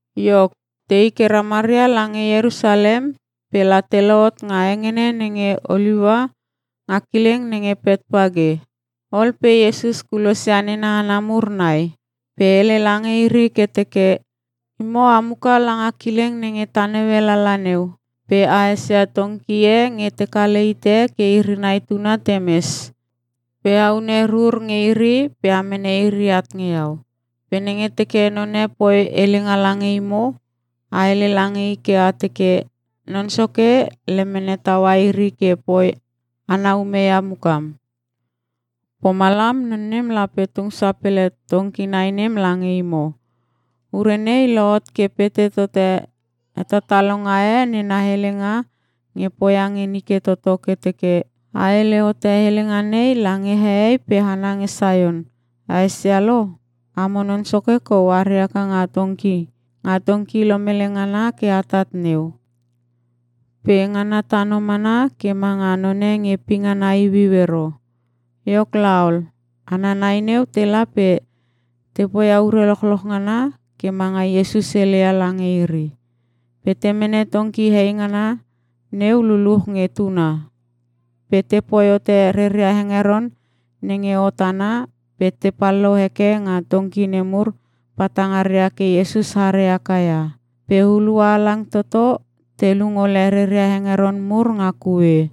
Iok, tei ke ramaria lange Ierusalem pe la te lohot nga hengene nenge Oliua nga kileng nenge Petpage. Ol pe Iesus kulosia nena hana mur nai pe hele lange iri ke teke, “Imo a muka langa kileng nenge ta naue lala neu pe a esia tongki e nge te kale hite ke iri nai tuna te mes. Pe a une rur nge iri pe a mene iri at nge Iau. Pe nenge teke none poi helenga lange imo, a hele lange i ke a teke, ‘Non Soke lemene taua iri ke poi ana ume ia mukam.’ Pomalam, non nem lape tung sapele tongki nai nem lange imo.” Ure nei lohot ke pete tote hetatalonga e nena helenga nge poia nge nike toto ke teke: “A hele hote helenga nei lange hehei pe hana nge Saion, ‘A esia lo, amo Non Soke kou are haka nga tongki, nga tongki lomele ngana ke atat neu. Pe ngana tano mana ke manga none nge pingana iuiu ero.’” Iok laol, hana nai neu tela pe te poia ure lochloch ngana ke manga Iesus heleia lange iri. Pe te mene tongki hei ngana neu luluch nge tuna. Pe te poi hote reria hengeron nenge hot ana pe te pallou heke nga tongki nemur patangaria ke Iesus are haka ia. Pe hulua halang toto te lung ole reria hengeron mur nga kue.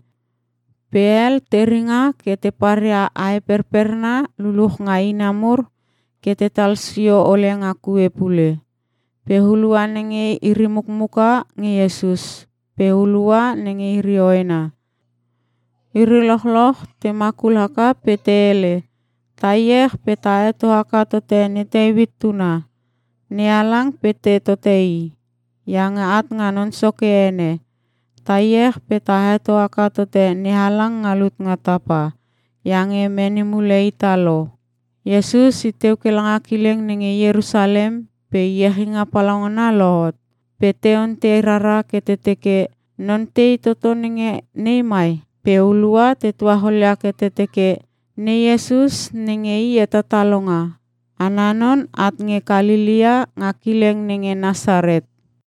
Pe hel te ringa ke te paria ae perperna luluche ina mur ke tetal sio ole nga kue pule. Pe hulua nenge iri mukmuka nge Iesus pe hulua nenge iri hoena, iri lochloch te makul haka pe te hele, “Ta iech pe ta heto haka tote ne Teuit Tuna! NeHalang pete tote i, iange at nga Non Soke ene! Ta iech pe ta heto haka tote NeHalang nga lut nga tapa, iange mene mule ita lo!” Iesus i teu nga kileng nenge Ierusalem pe iechinga palaungana lohot. Pe te ontei rara ke te teke, “Non tei toto nenge nei mai?” Pe hulua te tuacholia ke te teke, “Ne Iesus nenge I hetatalonga! Ana non at nge Kalelea nga kileng nenge Nasaret.”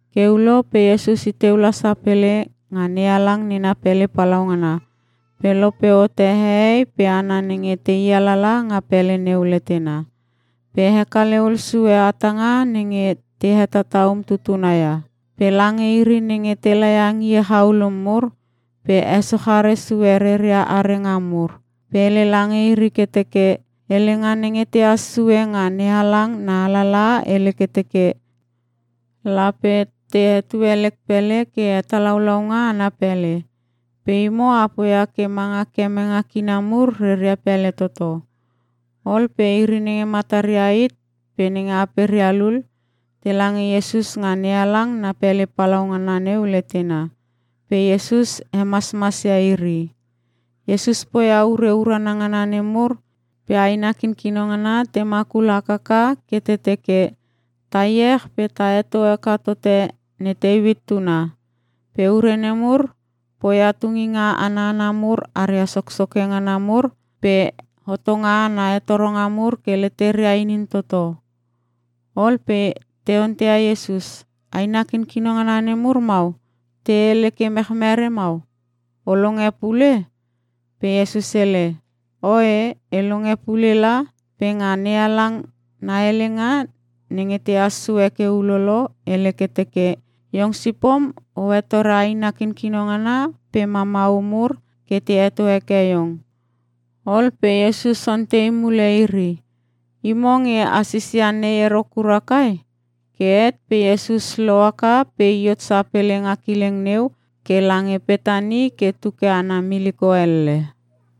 Ke ulo pe Iesus iteu la sapele nga NeHalang nena pele palaungana pe lope hote hehei pe hana nenge tei alala nga pele neu letena. Pe hekale hul sue hatanga nenge te hetata umtutuna ia. Pe lange iri nenge te laia ngie chaulum mur pe hesochare sue reria arenga mur. Pe hele lange iri ke teke, “Helenga nenge tehas sue nga NeHalang na alalaha hele ke teke, ‘Lape te hetue lek pele ke hetalaulaunga ana pele.’ Pe imo a poia ke manga kemenge kina mur reria pele toto.” Ol pe iri nenge mataria hit pe nenge aperia lul, tela nge Iesus nga NeHalang na pele palaungana neu letena pe Iesus hemasmasia iri. Iesus poia ure urana ngana nemur pe aina kinkino ngana te makul hakaka ke te teke, “Ta iech pe ta heto haka tote ne Teuit Tuna.” Pe ure nemur poia tunginga ana hana mur aria soksoke ngana mur pe hotonga ana hetoronga mur ke leteria inin toto. Ol pe te onteia Iesus, “Aina kinkino ngana nemur mau te hele ke merechre mau? O longe pule?” Pe Iesus hele, “Oe e longe pule la. Pe nga NeHalang na helenga nenge tehas sue ke ulolo, hele ke teke, “‘Iong sipom o hetore aina kinkino ngana pe mamau mur ke te heto heke iong.’” Ol pe Iesus ontei mule iri, “Imo nge a sisia nei ero kura kai?” Ke het pe Iesus lohaka pe i hot sapele nga kileng neu ke lange Petani pe tu ke ana miliko elle.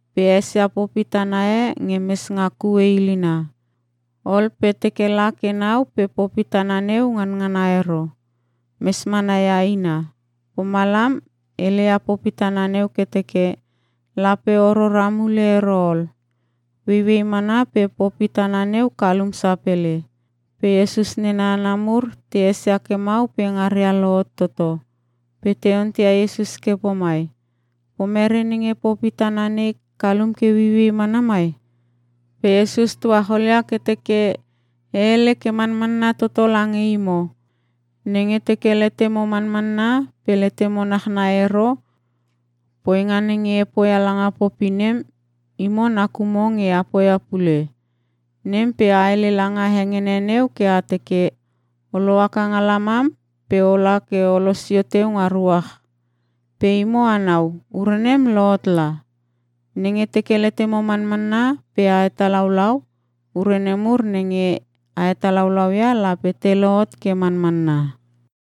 Pe esia popi tana e nge mes nga kue ilina. Ol pe teke la ke nau pe popi tana neu nganangana ero. Mes mana ia ina. Pomalam heleia popi tana neu ke teke, “Lape o rora mule ero ol!” Ueiuei mana pe popi tana neu kalum sapele. Pe Iesus nena hana mur te esia ke mau pe ngaria lohot toto, pe te onteia Iesus ke pomai, “Pomere nenge popi tana nei kalum ke ueiuei mana mai?” Pe Iesus tuacholia ke teke, “E hele ke manmanna toto lange imo, nenge teke letemo manmanna pe letemo nachnai ero, poinga nenge e poia langa popi nem, imo nakumo nge a poia pule. Nem pe a hele langa hengene neu ke a teke, ‘O lohaka nga lamam pe ola ke o losio teu nga ruach.’ Pe imo anau, ure nem lohot la. Nenge teke letemo manmanna pe a hetalaulau, ure nemur nenge a hetalaulau ia lape te lohot ke manmanna.”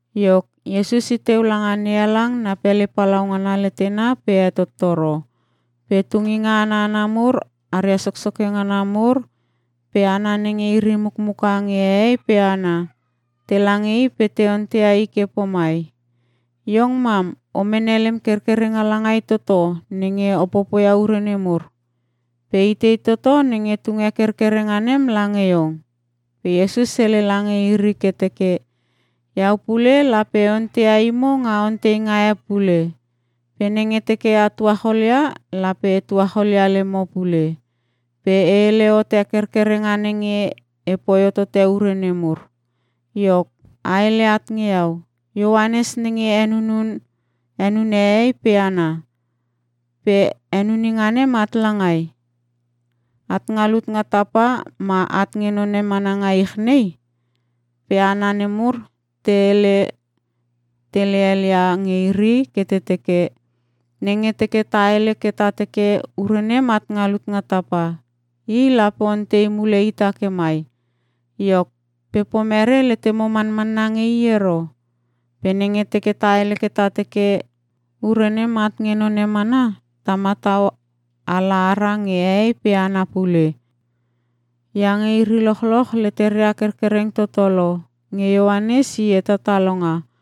Iok, Iesus i teu langa NeHalang na pele palaungana letena pe hetottoro. Pe tunginga ana hana mur aria soksoke ngana mur pe hana nenge iri mukmuka nge hehei pe hana, tela nge I pe te onteia I ke pomai, “Iong mam o mene lem kerkerenga langai toto nenge o popoia ure nemur? Pe itei toto nenge tunge kerkerenga nem lange Iong?” Pe Iesus hele lange iri ke teke, “Iau pule lape e onteia imo nga onteinga e pule. Pe nenge teke a tuacholia, lape e tuacholia lemo pule. Pe e hele hote kerkerenga nenge e poi hohote ure nemur. Iok, a hele at nge Iau. Ioanes nenge henunun henune hehei pe hana. Pe henuninga nem at langai? At nga lut nga tapa ma at nge none mana nga ich nei?” Pe hana nemur te hele tele helia nge iri ke te teke, “Nenge teke ta hele ke ta teke, ‘Ure nem at nga lut nga tapa.’ I lape ontei mule ita ke mai, ‘Iok, pe pomere letemo manmanna nge i ero?’ Pe nenge teke ta hele ke ta teke, ‘Ure nem at nge none mana,’ ta matau ala ara nge hehei pe hana pule. Iange iri lochloch leteria kerkereng toto lo nge Ioanes i hetatalonga.”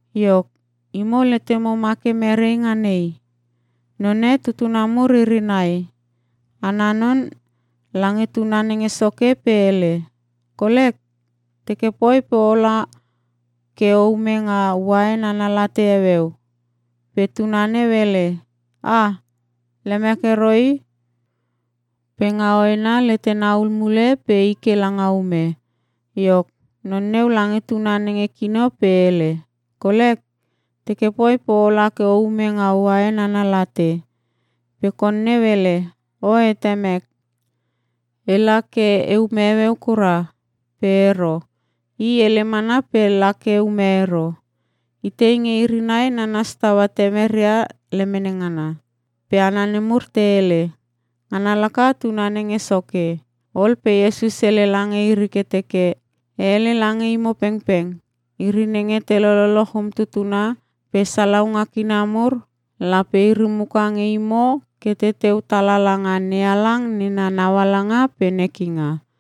“Iok, imo letemo ma ke merei nga nei? None tutuna mur iri nai. Ana non lange tuna nenge soke pe hele, ‘Kolek, teke poi pe ola ke o ume nga uain ana late heueu.’ “Pe tuna neu hele, ‘Ah! Lemek ero i!’ Pe nga hoena letena hul mule pe i ke langa ume. “Iok, non neu lange tuna nenge kino pe hele, ‘Kolek, teke poi pe ola ke o ume nga uain ana late.’ Pe kon neu hele, ‘Oe temek, ela ke e ume heueu kura.’ Pe ero. I hele mana pe la ke ume ero. “Itei nge iri nai nanas taua temeria lemene ngana?” Pe hana nemur te hele, “Ngana laka tuna nenge soke.” Ol pe Iesus hele lange iri ke teke, “E hele lange imo pengpeng, iri nenge te lololoch umtutuna pe salaunga kina mur, lape iri muka nge imo ke teteu tala langa NeHalang nena naualanga pe nekinga.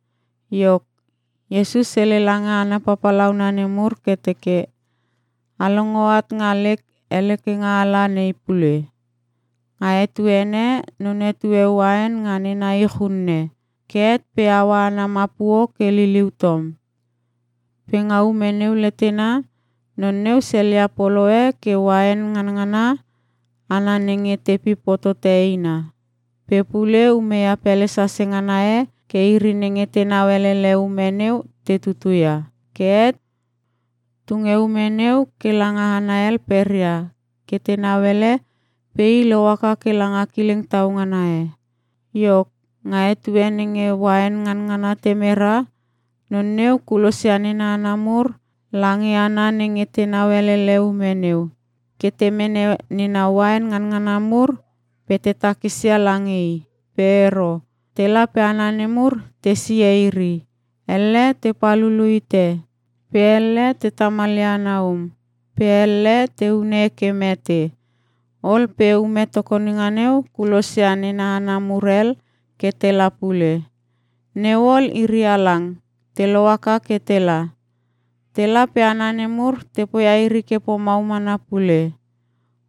Iok, Iesus hele lange hana papalauna nemur ke teke, “A longo at nga lek helekinga ala nei pule. Nga etuene none tue uain nga nena ich unne. Ke het pe haua ana mapuo ke liuliu tom. Pe nga ume neu letena, non neu selia polo e ke uain nganangana ana nenge te pip hotote eina. Pe pule umeia pele sase ngana e ke iri nenge tenau elele ume neu te tutu ia. Ke het tunge ume neu ke langa hana hel peria ke tenau ele, pe i lohaka ke langa kileng tau ngana e. Iok, nga etue nenge uain nganangana te mera, non neu kulosia nena hana mur lange hana nenge tenau elele ume neu, ke te mene nena uain nganangana mur pe te takisia lange i. “Pe ero. Tela pe hana nemur te sihe iri. Elle te pal hulu hite. Pe elle, te tamalia ana um. Pe elle, te hune ke mete. Ol pe ume tokoninga neu kulosia nena hana mur hel ke tela pule. Neu ol, iri halang te lohaka ke tela. Tela pe hana nemur te poia iri ke pomau mana pule.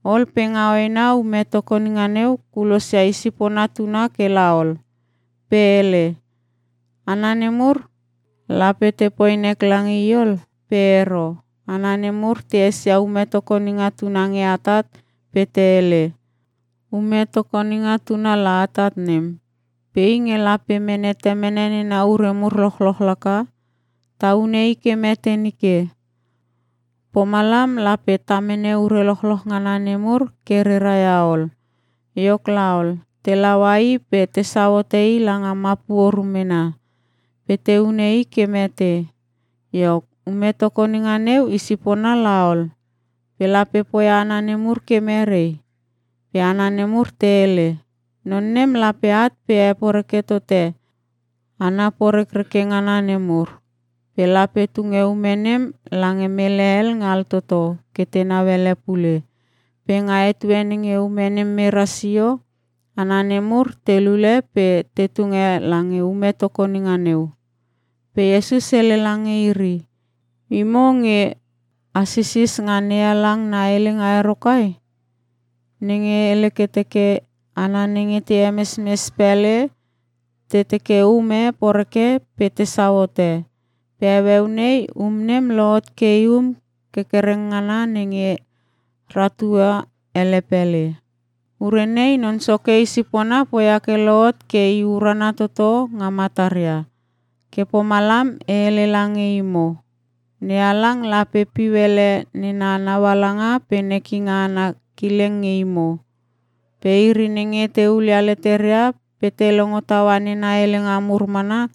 Ol pe nga hoena ume tokoninga neu kulosia i sipona tuna ke la ol. Pe hele, ‘Hana nemur, lape te poi nek lange i ol.’ “Pe ero. Hana nemur te esia ume tokoninga tuna nge atat pe te hele, ‘Ume tokoninga tuna la atat nem. Pe i nge lape mene temene nena ure mur lochloch laka. Ta hune i ke mete nike. Pomalam lape ta mene ure lochloch ngana nemur ke rera ia ol.’ Iok laol, te laua i pe tesau hote i langa mapuo rumena, pe te hune i ke mete. “Iok, ume tokoninga neu i sipona la ol. Pe lape poia hana nemur ke merei?” Pe hana nemur te hele, “Non nem lape at pe heporeke tote hana porekreke ngana nemur. Pe lape tunge ume nem lange mele hel nge altoto ke tenau ele pule. Pe nga etue nenge ume nem mera sio, hana nemur te lule pe te tunge lange ume tokoninga neu.” Pe Iesus hele lange iri, “Imo nge a sisis nga NeHalang na helenga ero kai? Nenge hele ke teke; “‘Hana nenge te hemesmes pele te teke um e poreke pe tesau hote. Pe heueu nei, um nem lohot ke i um kerkereng ngana nenge ratua hele pele. Ure nei Non Soke i sipona poia ke lohot pe i urana toto nga matara.’ “Ke pomalam e hele lange imo. NeHalang lape piu hele nena naualanga pe nekinga ana kileng nge imo. Pe iri nenge te hulia leteria pe te longo taua nena helenga mur mana,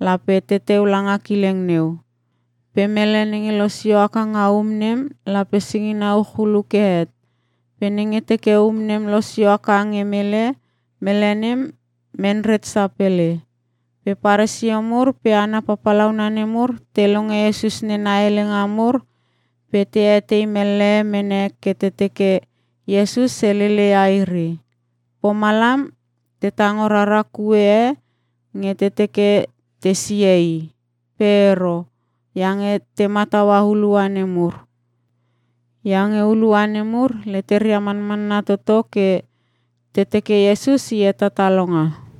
lape teteu langa kileng neu. Pe mele nenge losio haka nga um nem lape singina uch hulu ke het. Pe nenge teke um nem losio haka nge mele, mele nem menret sapele.” Pe Paresio mur pe hana papalauna nemur te longe Iesus nena helenga mur pe te etei mellehe mene ke te teke Iesus helele ia iri. Pomalam te tango rara kue e nge te teke te sihe I. Pe ero, iange te mataua hulua nemur. Iange hulua nemur leteria manmanna toto ke te teke Iesus I hetatalonga.